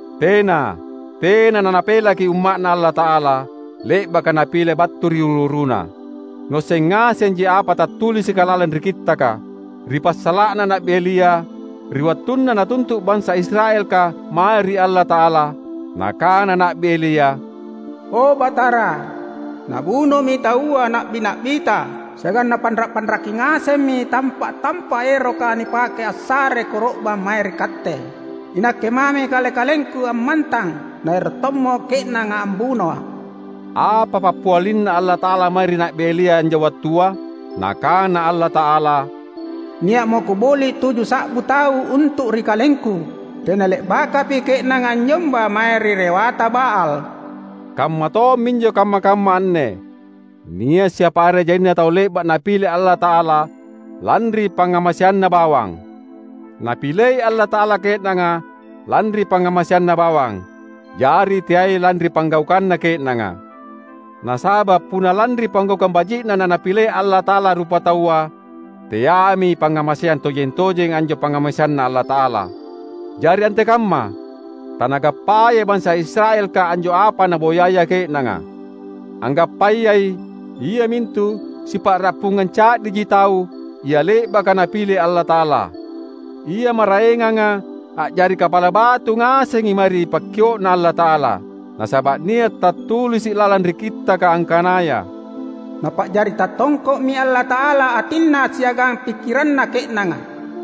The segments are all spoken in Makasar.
Tena! Tena naNapelaki umma’Na Allata’ala, le’baka Napile battu ri uru-uruna. Nuasseng ngasenji apa tattulisika lalang ri Kittaka, ri passala’na Na’bi Elia, ri wattunna natuntu’ bansa Israelka mae ri Allata’ala. Nakana Na’bi Elia, "O, Batara, nabunomi taua na’bi-na’biTa, siagang napanra’-panraki ngasemmi tampa’-tampa’ eroka nipake assare koro’bang mae ri Katte. Inakke mami kale-kalengku ammantang, naero’ tommo ke’nanga ambunoa’." Apa pappialinNa Allata’ala mae ri Na’bi Elia anjo wattua? Nakana Allata’ala, "Nia’mo Kuboli’ tuju sa’bu tau untu’ ri KalengKu. Tena le’bakapi ke’nanga anynyomba mae ri Rewata Baal." Kamma tomminjo kamma-kamma anne: nia’ siapa are jaina tau le’ba’ Napile Allata’ala lanri pangngamaseanNa bawang. Napilei Allata’ala ke’nanga lanri pangngamaseanNa bawang, jari teai lanri panggaukanna ke’nanga. Nasaba’ punna lanri panggaukang baji’na naNapilei Allata’ala rupataua, teaimi pangngamaseang tojeng-tojeng anjo pangngamaseanNa Allata’ala. Jari antekamma? Tanagappayai bansa Israelka anjo apa naboyaya ke’nanga. Anggappayai, iamintu sipa’rappungang ca’diji tau, ia le’baka Napile Allata’ala. Ia maraenganga, a’jari kapala batu ngasengi mae ri pakkio’Na Allata’ala. Nasaba’ nia’ tattulisi’ lalang ri Kittaka angkanaya, "Napa’jari tattongko’mi Allata’ala atinna siagang pikkiranna ke’nanga;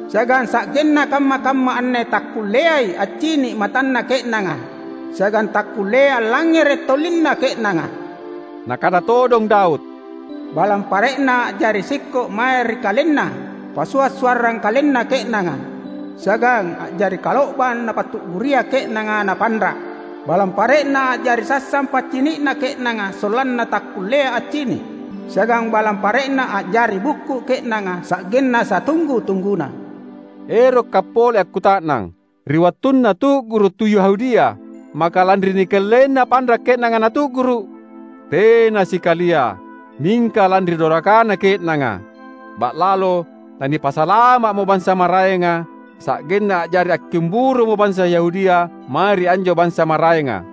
siagang sa’genna kamma-kamma anne takkulleai accini’ matanna ke’nanga, siagang takkulleai allangngere’ tolinna ke’nanga." Nakana todong Daud, "Balang pare’na a’jari sikko’ mae ri kalenna passua’-suarrang kalenna ke’nanga, siagang a’jari kalo’bang napatu’guria ke’nanga, napanra’. Balang pare’na a’jari sassang paccini’na ke’nanga sollanna takkullea accini’; siagang balang pare’na a’jari bukku’ ke’nanga sa’genna satunggu-tungguna." Erokka’ pole akkuta’nang: Ri wattunna tu’guru’ tu Yahudia, maka lanri nikellaina panra’ ke’nanga natu’guru’? Tena sikalia! Mingka lanri dorakana ke’nanga, ba’lalo nanipasalama’mo bansa maraenga, sa’genna a’jari akkimburumo bansa Yahudia mae ri anjo bansa maraenga.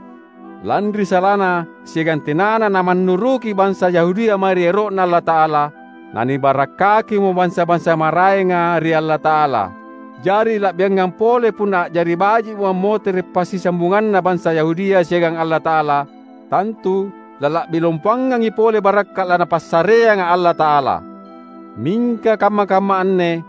Lanri salana siagang tenana manannuruki bansa Yahudia mae ri ero’Na Allata’ala, nanibarakkakimo bansa-bansa maraenga ri Allata’ala. Jari la’biangampa pole punna a’jari baji’mo ammotere’ passisambunganna bansa Yahudia siagang Allata’ala; tantu lala’bi lompoangangi pole barakka’ laNapassareanga Allata’ala! Mingka kamma-kamma anne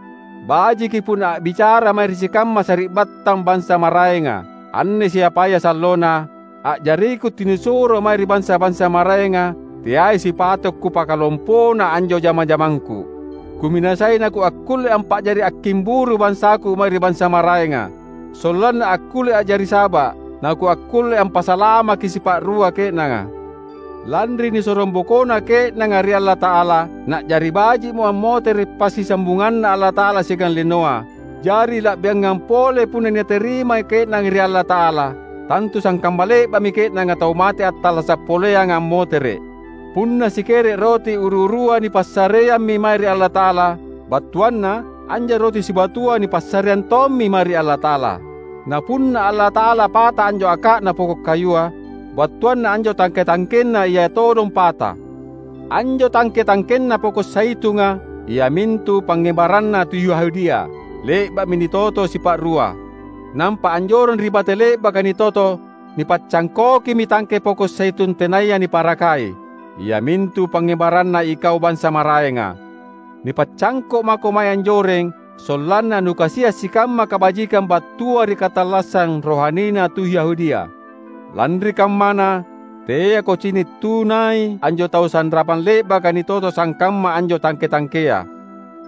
bajiki punna a’bicara’ mae ri sikamma sari’battang bansa maraenga. Anne siapaya sallona, a’jariku tunisuro mae ri bansa-bansa maraenga, teai sipato’ kupakalompona anjo jama-jamangku. Kuminasai nakuakkulle ampa’jari akkimburu bansaku mae ri bansa maraenga, sollanna akkulle a’jari saba’ nakuakkulle ampasalamaki sipa’rua ke’nanga. Lanri nisorongbokona ke’nanga ri Allata’ala, na’jari baji’mo ammotere’ passisambunganNa Allata’ala siagang linoa; jari la’biangampa pole punna nitarima ke’nanga ri Allata’ala! Tantu sangkamma le’ba’mi ke’nanga tau mate attallasa’ poleanga ammotere’! Punna sikere’ roti uru-urua nipassareammi mae ri Allata’ala, battuanna anjo roti sibatua nipassareang tommi mae ri Allata’ala. Na punna Allata’ala pata anjo aka’na poko’ kayua, battuanna anjo tangke-tangkenna Ia todong pata. Anjo tangke-tangkenna poko’ zaitunga — iamintu pangngebaranna tu Yahudia — le’ba’mi nitoto sipa’rua. Nampa anjoreng ri bate le’baka nitoto nipaccangkokimi tangke poko’ zaitun tenaya niparakai, iamintu pangngebaranna ikau bansa maraenga. Nipacangko’ mako mae anjoreng sollanna nukasia’ sikamma kabajikang battua ri katallassang rohanina tu Yahudia. Lanri kammana, teako cini’ tunai anjo tau sanrapang le’baka nitoto sangkamma anjo tangke-tangkea.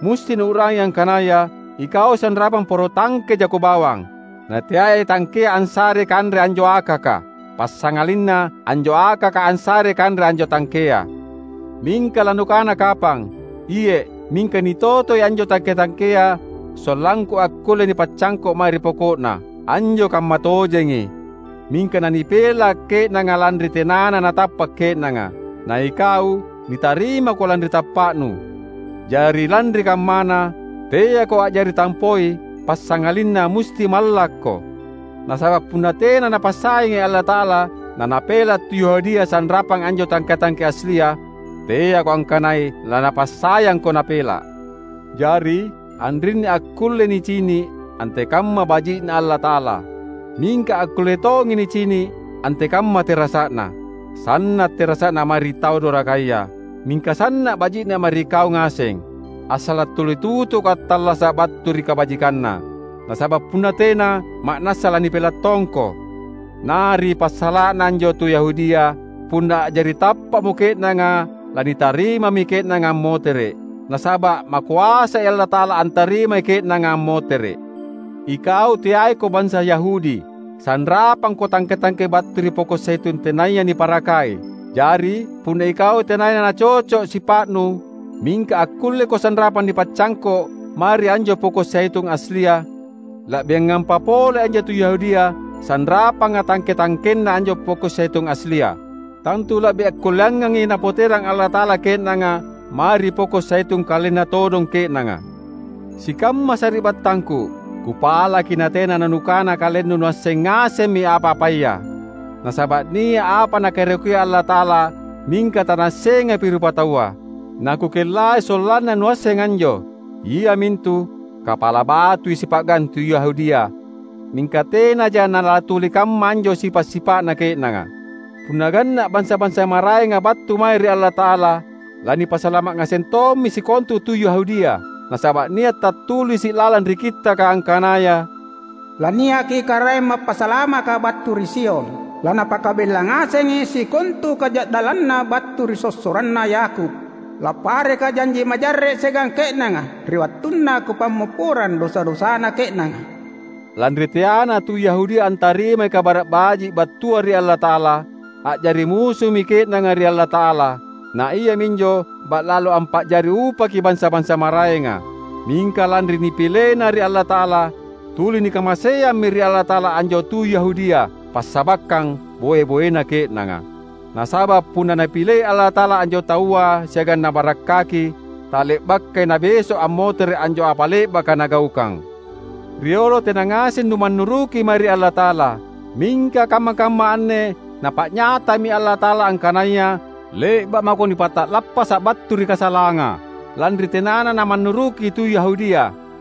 Musti nuu’rangi angkanaya ikau sanrapang poro tangke jako bawang. Nateai tangkea assarei kanre anjo akaka, passangalinna anjo akaka assarei kanre anjo tangkea. Mingka lanukana kapang, "Iye’, mingka nitotoi anjo tangke-tangkea sollangku akkulle nipacangko’ mae ri poko’na!" Anjo kammatojengi. Mingka nanipela’ ke’nanga lanri tenana natappa’ ke’nanga, naikau nitarimako lanri tappa’nu. Jari lanri kammana, teako a’jari tampoi; passangalinna musti mallakko. Nasaba’ punna tena Napassayangi Allata’ala naNapela’ tu Yahudia sanrapang anjo tangke-tangke aslia, teako angkanai laNapassayangko Napela’! Jari anrinni akkullei nicini’ antekamma baji’Na Allata’ala, mingka akkulle tongi nicini’ antekamma terasa’Na. Sanna’ terasa’Na mae ri tau dorakaya, mingka sanna’ baji’Na mae ri kau ngaseng — assala’ tuli tutuko attallasa’ battu ri kabajikanNa. Nasaba’ punna tena, ma’nassa lanipela’ tongko. Na ri passala’na anjo tu Yahudia, punna a’jari tappa’mo ke’nanga lanitarimami ke’nanga ammotere’; nasaba’ makoasai Allata’ala antarimai ke’nanga ammotere’. Ikau teaiko bansa Yahudi, sanrapangko tangke-tangke battu ri poko’ zaitun tenaya niparakai. Jari, punna ikau tenaya nacoco’ sipa’nu, mingka akkulleko sanrapang nipacangko’ mae ri anjo poko’ zaitun aslia, la’biangampa pole anjo tu Yahudia sanrapanga tangke-tangkenna anjo poko’ zaitun aslia. Tantu la’bi akkulleangangi Napoterang Allata’ala ke’nanga mae ri poko’ zaitun kalenna todong ke’nanga. Sikamma sari’battangku! Kupalaki natena nanukana kalennu nuasseng ngasemmi apa-apaya. Nasaba’ nia’ apa Nakaeroki Allata’ala mingka tanaassengapi rupataua. Nakukellai sollanna nuasseng anjo; iamintu: Kapala batui sipa’gang tu Yahudia; mingka tenaja nalatuli kamma anjo sipa’-sipa’na ke’nanga. Punna ganna’ bansa-bansa maraenga battu mae ri Allata’ala, lanipasalama’ ngaseng tommi sikontu tu Yahudia. Nasaba’ nia’ tattulisi’ lalang ri Kittaka angkanaya, "Laniaki Karaeng Mappasalamaka battu ri Sion; laNapakabella ngasengi sikontu kaja’dallanna battu ri sossoranna Yakub. LapparekKa’ janji majarre’ siagang ke’nanga ri wattunna Kupammopporang dosa-dosana ke’nanga." Lanri teana tu Yahudia antarimai Kabara’ Baji’ battua ri Allata’ala, a’jari musumi ke’nanga ri Allata’ala; na iaminjo ba’lalo ampa’jari upaki bansa-bansa maraenga. Mingka lanri nipilena ri Allata’ala, tuli nikamaseammi ri Allata’ala anjo tu Yahudia, passabakkang boe-boena ke’nanga. Nasaba’ punna Napilei Allata’ala anjo taua siagang Nabarakkaki, tale’bakai Nabeso’ ammotere’ anjo apa le’baka Nagaukang. Riolo tena ngaseng numannuruki mae ri Allata’ala. Mingka kamma-kamma anne Napa’nyatami Allata’ala angkanaya le’ba’ mako nipata’lappasa’ battu ri kasalanga, lanri tenana namannuruki tu Yahudia.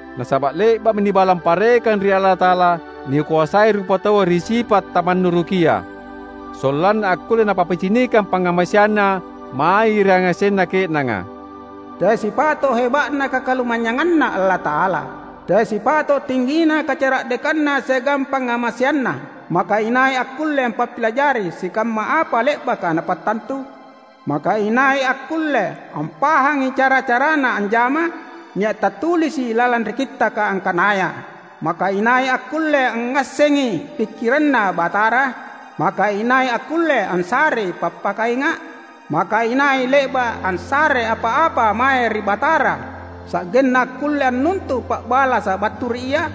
Nasaba’ le’ba’mi nibalang parekang ri Allata’ala nikoasai rupataua ri sipa’ tamannurukia, sollanna akkulle Napappicinikang pangngamaseanNa mae ri yangasenna ke’nanga. Teai sipato’ heba’na kakalumanynyanganNa Allata’ala! Teai sipato’ tinggina kacara’dekanNa siagang pangngamaseanNa! Maka inai akkulle ampappilajari sikamma apa le’baka Napattantu? Maka inai akkulle ampahangi cara-caraNa anjama? Nia’ tattulisi’ lalang ri Kittaka angkanaya, "Maka inai akkulle angngassengi pikkiranNa Batara? Maka inai akkulle assarei pappakainga’? Maka inai le’ba’ assare apa-apa mae ri Batara sa’genna akkulle annuntu’ pa’balasa’ battu ri Ia?"